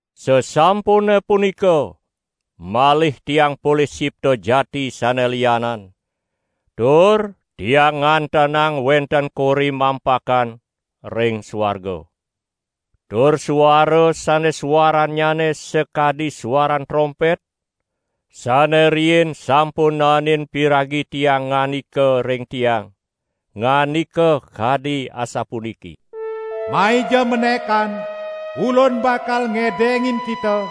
Sasampune punika malih tiang polih sipta jati sane lianan, tur tiang ngantenang wenten kori mampakan ring suarga. Tur suara sane suarannyane sakadi suaran trompet, sane riin sampun naenin piragi tiang ngandika ring tiang, ngandika kadi asapuniki: "Maija menekan, Ulun bakal ngedengin kita,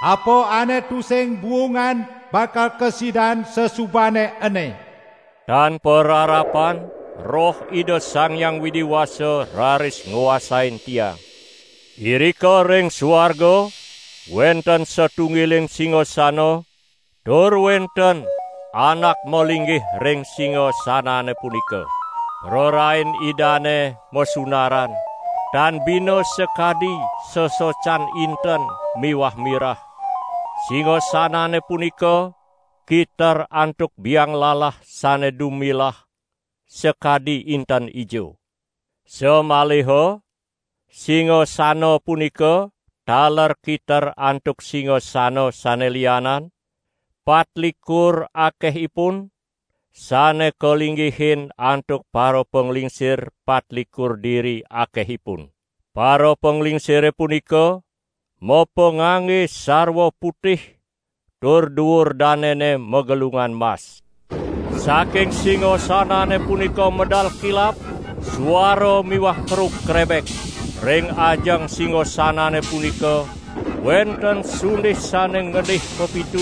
apa ane tusing buungan bakal kasidan sasubane ene." Tan pararapan Roh Ida Sang Hyang Widi Wasa raris nguasain tiang. Irika ring suarga wenten satunggiling singasana, tur wenten anak malinggih ring singasanane punika. Prarain Idane masunaran, tan bina sakadi sesocan inten miwah mirah; singasanane punika kiter antuk bianglalah sane dumilah sakadi inten ijo. Samaliha singasana punika taler kiter antuk singasana sane lianan, patlikur akehipun, sane kalinggihin antuk parapanglingsir patlikur diri akehipun. Parapanglingsire punika mapangangge sarwa putih tur duur danene magelungan mas. Saking singasanane punika medal kilap, suara miwah kerug krebek. Ring ajeng singasanane punika wenten sundih sane ngendih pepitu;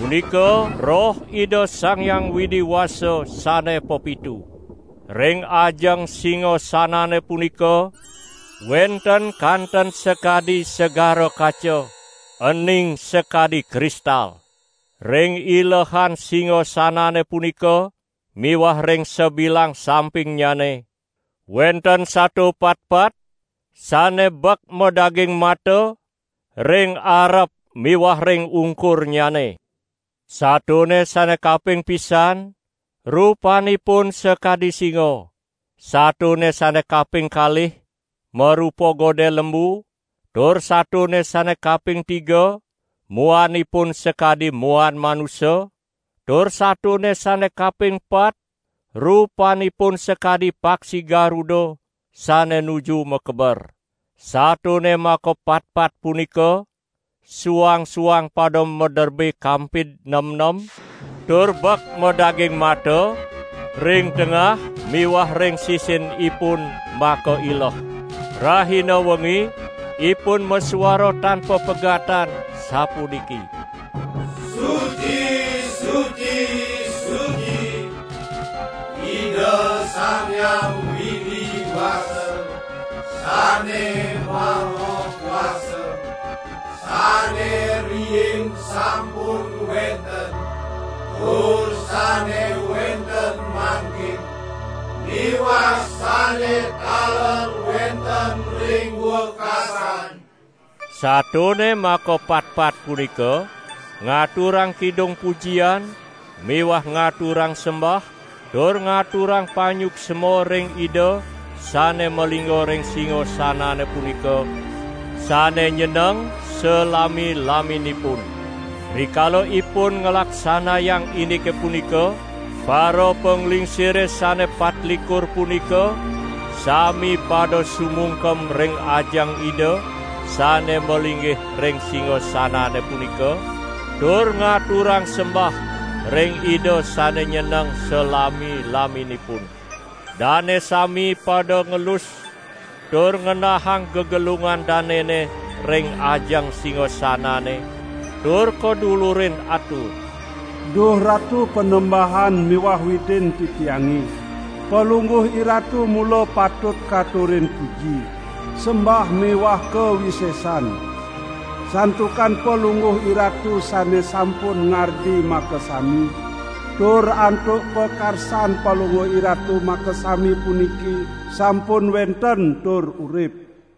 punika Roh Ida Sang Hyang Widi Wasa sane pepitu. Ring ajeng singasanane punika wenten kanten sakadi segara kaca, ening sakadi kristal. Ring ilehan singasanane punika miwah ring sabilang sampingnyane, wenten sato patpat, sane bek madaging mata, ring arep miwah ring ungkurnyane. Satone sane kaping pisan rupanipun sakadi singa; satone sane kaping kalih marupa godel lembu tur satone sane kaping tiga muanipun sakadi muan manusa; tur satone sane kaping pat rupanipun sakadi paksi garuda sane nuju makeber. Satone makapatpat punika suang-suang pada maderbe kampid nemnem, tur bek madaging mata, ring tengah miwah ring sisinipun makaileh. Rahina wengi ipun masuara tan papegatan sapuniki: "Suci, suci, suci, Ida Sang Hyang Widi Wasa, Sane Maha Kuasa, sane riin sampun wenten, tur sane wenten mangkin miwah sane taler wenten ring wekasan." Satone makapatpat punika ngaturang kidung pujian miwah ngaturang sembah tur ngaturang panyuksma ring Ida sane malingga ring singasanane punika sane nyeneng salami-laminipun. Rikala ipun nglaksanayang indike punika, parapanglingsire sane patlikur punika sami pada sumungkem ring ajeng Ida sane malinggih ring singasanane punika, tur ngaturang sembah ring Ida sane nyeneng salami-laminipun. Dane sami pada ngelus tur ngenahang gegelungan danene ring ajeng singasanane tur kadulurin atur: "Duh Ratu Panembahan miwah Widin titiange, Palungguh IRatu mula patut katurin puji, sembah miwah kawisesan. Santukan Palungguh IRatu sane sampun ngardi makasami, tur antuk pakarsan Palungguh IRatu makasami puniki sampun wenten tur urip."